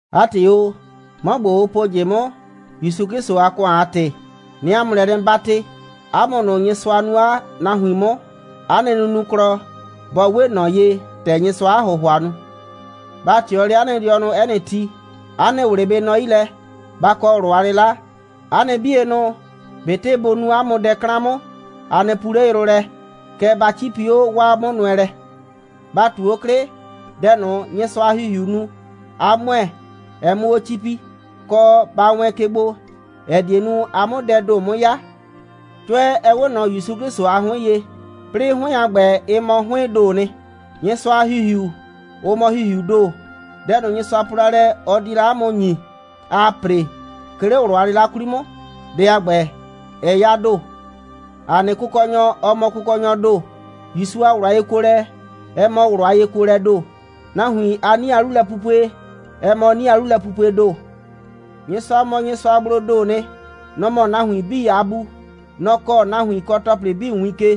'A ‑tɩ o, 'mɔ ‑gbo, ʋ po ꞊jɩ 'mʋ, ‑Yusu 'Klɩsʋ a ‑kʋan a ‑tɩ, 'nɩɩ 'a mʋ lɛ 'nɩ 'batɩ: 'A mʋ ꞊nʋ, Nyɩsʋa nuu 'a nahuin 'mʋ, 'a nɩ nunuklɔ, bɔ 'we ꞊nɔ ye, ‑tɛ Nyɩsʋaa 'a ‑hʋhʋa nu. Ba ꞊tɩɔ 'le 'a nɩ dɩɔnʋ 'ɛ nɩ ti, 'a nɩ ꞊wlɩ bɩ nɔ 'yi lɛ, ba kɔ ꞊wlʋ a 'lɩla, 'a nɩ 'bienʋ, ꞊betɩ bʋ nu 'a mʋ dɛ 'klan 'mʋ, a nɩ puu 'le yrʋ lɛ, kɛɛ, ba 'cipi 'o 'waa 'mʋnʋɛlɛ. Ba ꞊tu 'o 'klɩ, dɛ ꞊nʋ, Nyɩsʋa a ‑Hihiu nu, ꞊a ‑mʋɛ, ɛ 'mʋ 'o 'cipi, kɔ, ba wɛɛn ke gbo, ‑ɛ die nu, a 'mʋ dɛɛ ‑do 'mʋ 'ya. 'Cʋɛ, ɛ 'we ꞊nɔ ‑Yusu 'Klɩsʋ a 'hʋɩn ye, 'plɩɩ 'hʋɩn a ‑gbɛ, ɩ mɔ 'hʋɩɩn ‑doo nɩ. Nyɩsʋa a ‑Hihiu, ʋ mɔ ‑Hihiuu ‑do. Dɛ ꞊nʋ, Nyɩsʋa po la lɛ, ɔ di la 'a mʋ ‑nyi, aa ‑pre, 'ke 'le ꞊wlʋ a 'lɩla 'kwli 'mʋ, dɛ a ‑gbɛ, ɛ 'ya ‑do. ‑A nɩ Kʋkɔnyɔ, ɔ mɔ Kʋkɔnyɔɔ ‑do. ‑Yusu a ꞊wlʋ a yekuolɛ, ɛ mɔ ꞊wlʋ a yekuolɛɛ ‑do. Nahuin a 'nie a 'lulɛpupue, ɛ mɔ 'nie a 'lulɛpupuee ‑do. Nyɩsʋa mɔ Nyɩsʋagbloo ‑doo nɩ. Nɔ‑ mɔ nahuin 'bii a Bu. Nɔ‑ kɔɔ nahuin kɔ ‑tɔplɩ 'bii win ke.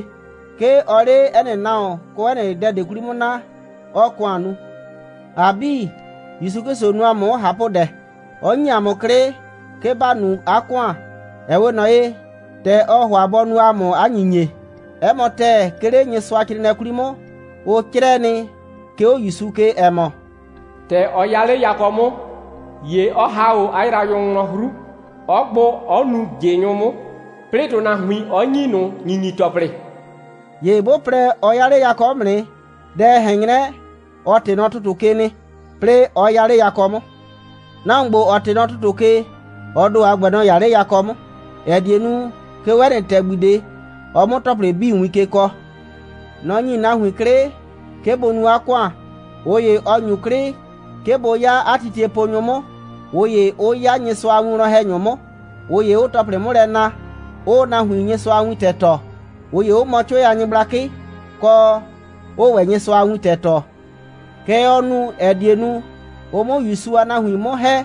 'Ke ɔɔ 'le 'ɛ nɩ nahuon kɔ 'ɛ nɩ dɛ ꞊de 'kwli 'mʋ naa, 'ɔɔ ‑kʋan nu. ‑A 'bii, ‑Yusu 'Klɩsʋ nu ‑a mʋ 'mʋ ꞊hapʋdɛ, 'ɔ ‑nyi ‑a mʋ 'klɩ, 'ke ‑ba nu 'a ‑kʋan, ‑ɛ 'we ꞊nɔ ye, ‑tɛ ɔ ‑hʋa bɔ nu ‑a mʋ 'a ‑nyinyie. 'Ɛ mɔ ‑tɛɛ, 'ke 'le Nyɩsʋacrɩɩnɩɛ 'kwli 'mʋ, ʋ 'crɛɛ nɩ, 'ke 'o ‑Yusu ke, ‑ɛ mɔ: «‑Tɛ ɔ 'ya 'le yakɔ 'mʋ, ‑ye ɔ ‑ha 'o 'a yraanyʋ wlɔn 'hru, 'ɔ gbʋ, 'ɔ nuu ꞊jɩnyʋ 'mʋ, 'plɩɩ ‑tʋnahuin, 'ɔ ‑nyi ꞊nʋ ‑nyinyi‑tɔplɩ.» ‑Ye 'bʋ plɛ, ɔ 'ya 'le yakɔ 'mʋ nɩ, dɛ, ɛ ꞊hɛn 'nyrɛ, ɔ ꞊tɩ nɔ ‑tʋtʋ ke nɩ, 'plɩɩ, 'ɔ 'ya 'le yakɔ 'mʋ. Nahuon ‑gbo, ‑ɔ ꞊tɩ nɔ ‑tʋtʋ ke, ɔ ‑do a ‑gbɛ, nɔ‑ 'ya 'le yakɔ 'mʋ, ‑ɛ die nu, 'ke 'o 'ɛ nɩ ‑tɛgbi ꞊de, ɔ 'mʋ ‑tɔplɩ 'bii win ke kɔɔ. Nɔ‑ ‑nyi nahuin 'klɩ, 'ke bʋ nu 'a ‑kʋan. ꞊Ʋ ‑ye, ɔ ‑nyu 'klɩ, 'ke bʋ 'ya 'a titieponyʋ 'mʋ, ꞊ʋ ‑ye, 'ʋ 'ya Nyɩsʋa a winwlɔn‑hɛnyʋ 'mʋ, ꞊ʋ ‑ye 'ʋʋ ‑tɔplɩ 'mʋ lɛ na, 'ʋʋ nahuin Nyɩsʋa a wintɛ tɔɔ, ꞊ʋ ‑ye 'ʋ mɔ 'cʋɛ a nyɩgblakɩ, kɔ, 'ʋʋ ‑wɛ Nyɩsʋa a wintɛ tɔɔ. Kɛ ɔ nu, ‑ɛ die nu, ʋ 'mʋ ‑Yusu a nahuin 'mʋ ‑hɛ,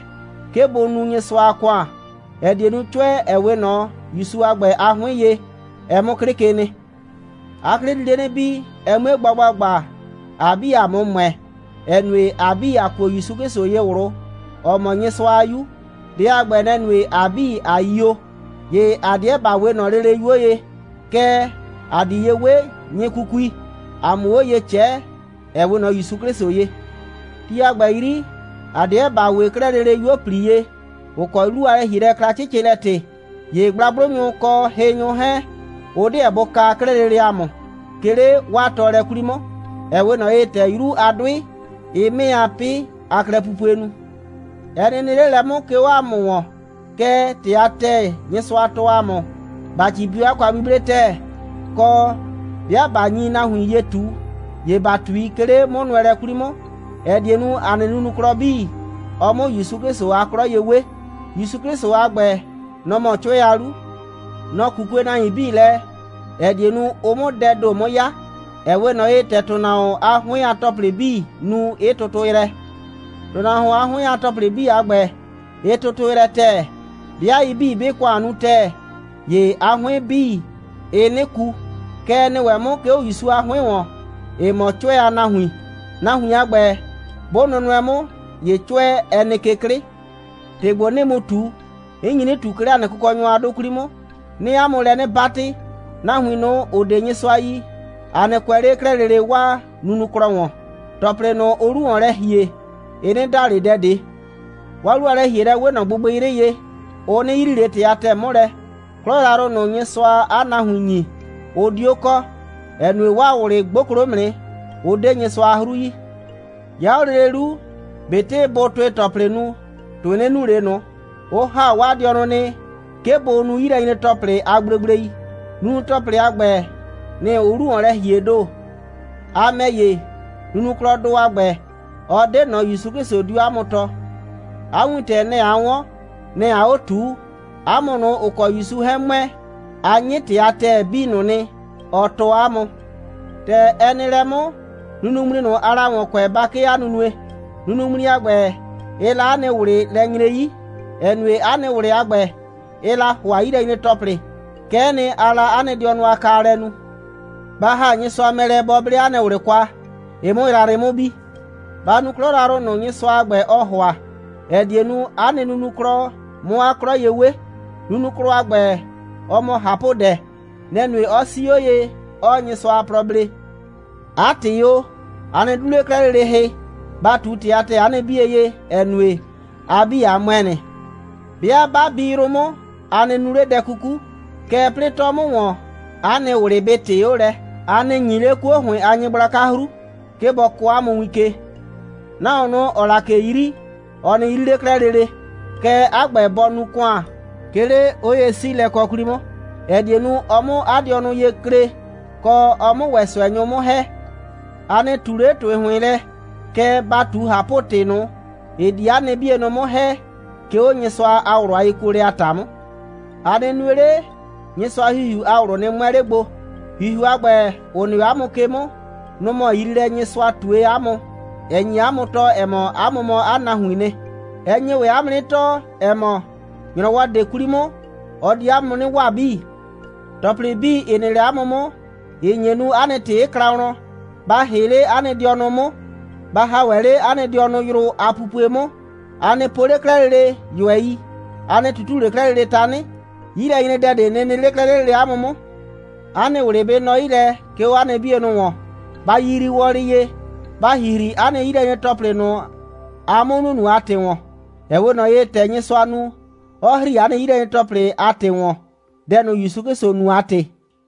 'ke bʋ nu Nyɩsʋa a ‑kʋan, ‑ɛ die nu, 'cʋɛ, ‑ɛ 'we ꞊nɔ ‑Yusu a ‑gbɛ a 'hʋɩn ye, ɛ 'mʋ 'klɩ ke nɩ. 'A 'klɩ di 'le 'nɩ bii, ɛ 'mue gba ‑gbagba, ‑a 'bii, ‑a 'mʋ ‑mʋɛ, ‑ɛ nue, ‑a 'bii, ‑a kuo ‑Yusu 'Klɩsʋ ye ꞊wlʋ, ‑ɔ mɔ Nyɩsʋa a 'Yu. Dɛ a ‑gbɛ, nɛ‑ nue, ‑a 'bii, ꞊a yio. ‑Ye ‑a 'deɛ ‑ba 'we ꞊nɔ lele 'yuo ye, kɛɛ, ‑a di ye 'we nyɩkukui, ‑a 'mʋ 'o ye ꞊cɛɛ, ‑ɛ 'we ꞊nɔ ‑Yusu 'Klɩsʋ ye. Ti a ‑gbɛ 'yri, ‑a 'deɛ ‑ba 'we 'klɛɛ lele 'yuo꞊pli ye, ‑ʋ kɔ 'lu a lɛ‑hielɛ kla 'cɩcɩlɛ‑tɩ. ‑Ye gblagblʋnyʋ kɔ hɩnyʋ 'hɛɛn, ʋ 'deɛ bʋ kaa 'klɛɛ lele ‑a mʋ, 'ke 'le 'waa tɔɔlɛ 'kwli 'mʋ, ‑ɛ 'we ꞊nɔ ye, ‑tɛ 'yru a 'dʋɩ, ɩɩ 'mɩɩ a 'pɩ a klɛpupue nu. Ɛ nɩ nɩ 'le lɛ 'mʋ, 'ke 'o ‑a mʋ ‑wɔn. Kɛɛ, ‑tɩ a ‑tɛɛ, Nyɩsʋa tɔɔ ‑a mʋ, ‑ba 'cipi 'o 'a kwa'buble ‑tɛɛ, kɔ, 'bɩa ꞊ba nyi nahuin ye ꞊tu, ‑ye ‑ba ꞊tui, 'ke 'le 'mʋnʋɛlɛ 'kwli 'mʋ, ‑ɛ die nu, ‑a nɩ nunuklɔ 'bii, ɔ 'mʋ ‑Yusu 'Klɩsʋ a 'klɔ ye 'we. ‑Yusu 'Klɩsʋ a ‑gbɛ, nɔ ‑mɔ 'cʋɛ a 'lu. Nɔ‑ 'kukue 'a nahuin 'bii lɛ, ‑ɛ die nu, ʋ 'mʋ dɛɛ ‑do 'mʋ 'ya, ‑ɛ 'we ꞊nɔ ye, ‑tɛ ‑tʋnahuon a 'hʋɩn a ‑tɔplɩ 'bii nu, 'ɩ tʋtʋ yrɛ. ‑Tʋnahuon a 'hʋɩn a ‑tɔplɩ a ‑gbɛ, ‑ɩ tʋtʋ yrɛ ‑tɛɛ, 'bɩa ɩ 'bii, 'bɩɩ ‑kʋan nu ‑tɛɛ, ‑ye 'a 'hʋɩn 'bii, ɩɩ 'nɩ ku. Kɛ ɛ nɩ ‑wɛ 'mʋ, 'ke 'o ‑Yusu a 'hʋɩn ‑wɔn, ‑ɩ mɔ 'cʋɛ a nahuin. Nahuin a ‑gbɛ, 'bʋ nʋnʋɛ 'mʋ, ‑ye 'cʋɛ, ɛ nɩ ke 'klɩ. ‑Tɩ ‑gbo, 'nɩɩ mu ꞊tu, 'n nyi 'nɩ ꞊tu, 'ke 'le ‑a nɩ Kʋkɔnyɔ a 'dʋ 'kwli 'mʋ. 'Nɩɩ 'a mʋ lɛ 'nɩ 'batɩ: Nahuin ꞊nʋ, ‑ʋ 'de Nyɩsʋa yi, a nɩ kʋɛ 'le 'klɛɛ lele 'waa nunuklɔ ‑wɔn. ‑Tɔplɩ ꞊nʋ, ʋʋ 'lu ‑wɔn lɛ ‑hie, ɩ 'nɩ da ꞊le dɛ ꞊de. 'Waa 'lu a lɛ‑hielɛ 'we ꞊nɔ gbɩgbɩyrɩ ye, ʋ 'nɩ yrii ꞊le ‑tɩ a ‑tɛɛ 'mʋ lɛ. 'Klɔ yrayrʋ ꞊nʋ, Nyɩsʋaa 'a nahuin ‑nyi, ʋ 'dio kɔ, ‑ɛ nue, 'waa ꞊wlɩ 'gboklo 'mʋ nɩ, 'ʋ 'de Nyɩsʋa a 'hru yi. 'Ya 'o lele 'lu, ꞊betɩ bʋʋ ‑tʋɩ‑tɔplɩ nu, ‑tʋɩ 'nɩ nu ꞊le ꞊nʋ. Ʋ ‑ha 'waa dɩɔnʋ nɩ, 'ke bʋ nu 'yilɛnyre‑tɔplɩ a gblegblei. Nunu‑tɔplɩ a ‑gbɛ, nɩ‑ ʋʋ 'lu ‑wɔn lɛ ‑hiee ‑do. A ‑mɛ ‑ye, nunuklɔdʋ a ‑gbɛ, ɔ 'de ꞊nɔ, ‑Yusu 'Klɩsʋ 'dio 'a mʋ tɔɔ. 'A wintɛ, nɛ‑ a 'wɔn. Nɛ‑ aa 'o ꞊tuu. 'A mʋ ꞊nʋ, ‑ʋ kɔ ‑Yusu 'hɛɛn ‑mʋɛ, a 'nyɩ ‑tɩ a ‑tɛɛ 'bii ꞊nʋ nɩ, ɔ tɔɔ ‑a mʋ. ‑Tɛ ɛ nɩ lɛ 'mʋ, nunuŋmli ꞊nʋ, aa la ‑wɔn kʋɛ, ba 'kee 'a nunue. Nunuŋmli a ‑gbɛ, ɩɩ la 'a nɩ ꞊wlɩ lɛ nyre 'yi, ‑ɛ nue, 'a nɩ ꞊wlɩ a ‑gbɛ, ɩɩ la ‑hʋa 'yilɛnyre‑tɔplɩ. Kɛ'ɛ nɩ, aa la 'a nɩ dɩɔnʋ a kaalɛ nu. Ba ‑ha Nyɩsʋa mɛ lɛ, bɔ 'ble 'a nɩ ꞊wlɩ kwa, ɩ 'mʋ yrayrɩ 'mʋ bi. Ba nu 'klɔ yrayrʋ ꞊nʋ, Nyɩsʋa a ‑gbɛ, ɔɔ ‑hʋa, ‑ɛ die nu, 'a nɩ nunuklɔ 'mʋ 'a 'klɔ ye 'we. Nunuklɔ a ‑gbɛ, ɔ mɔ ꞊hapʋdɛ. Nɛ‑ nue, 'ɔ 'sii 'o ye, 'ɔɔ Nyɩsʋa a plɔ blee. 'A ‑tɩ o, a nɩ 'du 'le 'klɛɛ lele hɩ, ba ꞊tu ‑tɩ a ‑tɛɛ 'a nɩ 'bie ye, ‑ɛ nue, ‑a 'bii, ‑a ‑mʋɛ nɩ. 'Bɩa 'ba bi yrʋ 'mʋ, a nɩ nu 'le dɛ 'kuku, kɛɛ, 'plɩɩ 'tɔ 'mʋ ‑wɔn, 'a nɩ ꞊wlɩ bɩ ꞊tɩɩ 'o lɛ. A nɩ ‑nyi 'le 'kuo ‑hʋɩn a nyɩgblaka 'hru, 'ke bɔ kɔɔ 'a mʋ win ke. Nahuon ꞊nʋ, ‑ɔɔ la ꞊ke 'yri, ɔ nɩ 'yri 'le 'klɛɛ lele, kɛɛ, 'a ‑gbɛ bɔ nu ‑kʋan, 'ke 'le 'oye'siilɛkɔ 'kwli 'mʋ, ‑ɛ die nu, ɔ 'mʋ 'a dɩɔnʋ ye klee, kɔ, ɔ 'mʋ ‑wɛ ꞊sʋɛnyʋ 'mʋ ‑hɛ. A nɩ ꞊tu 'le ‑tɩ ‑hʋɩn lɛ, kɛɛ, ba ꞊tu ꞊hapʋ‑tɩ ꞊nʋ, ‑ɩ di 'a nɩ 'bienʋ 'mʋ ‑hɛ, 'ke 'o Nyɩsʋa a ꞊wlʋ a yekuolɛ a ‑ta 'mʋ. A nɩ nue 'le, Nyɩsʋa a ‑Hihiu a ꞊wlʋ nɩ 'mʋɛ 'le gbo. ‑Hihiu a ‑gbɛ, ‑ʋ nɩ 'o 'a mʋ ke 'mʋ, nʋ‑ mɔ yriilɛ, Nyɩsʋa ꞊tue 'a mʋ, ‑ɛ nye 'a mʋ tɔɔ, ‑ɛ mɔ, 'a mʋ mɔ 'a nahuiin nɩ. Ɛ nye ‑wɛ 'a mʋ 'nɩ tɔɔ, ‑ɛ mɔ, ‑nyrɔwɔ ꞊de 'kwli 'mʋ, ɔ di 'a mʋ 'nɩ waa 'bii. ‑Tɔplɩ 'bii, ‑ɩ nɩ 'le 'a mʋ 'mʋ, ‑ɩ nye nu, 'a nɩ ‑tɩ 'ɩ kla wlɔn, ba ‑hɩ 'le 'a nɩ dɩɔnʋ 'mʋ, ba ‑ha ‑wɛ 'le 'a nɩ dɩɔnʋ yrʋ a pupue 'mʋ, a nɩ po 'le 'klɛɛ lele ꞊yʋɛi, a nɩ ꞊tutu 'le 'klɛɛ lele tanɩ, 'yilɛnyredɛ ꞊de nɩ nɩ 'le 'le 'klɛɛ lele 'a mʋ 'mʋ. 'A nɩ ꞊wlɩ bɩ nɔ 'yi lɛ, 'ke 'o 'a nɩ 'bienʋ ‑wɔn, ba yiyrii wɔlɩ ye, ba ‑hihri 'a nɩ 'yilɛnyre‑tɔplɩ ꞊nʋ, aa 'mʋ nunu a ‑tɩ ‑wɔn, ‑ɛ 'we ꞊nɔ ye, ‑tɛ Nyɩsʋa nu, 'ɔ ‑hri 'a nɩ 'yilɛnyre‑tɔplɩ a ‑tɩ ‑wɔn, dɛ ꞊nʋ, ‑Yusu 'Klɩsʋ nu a ‑tɩ.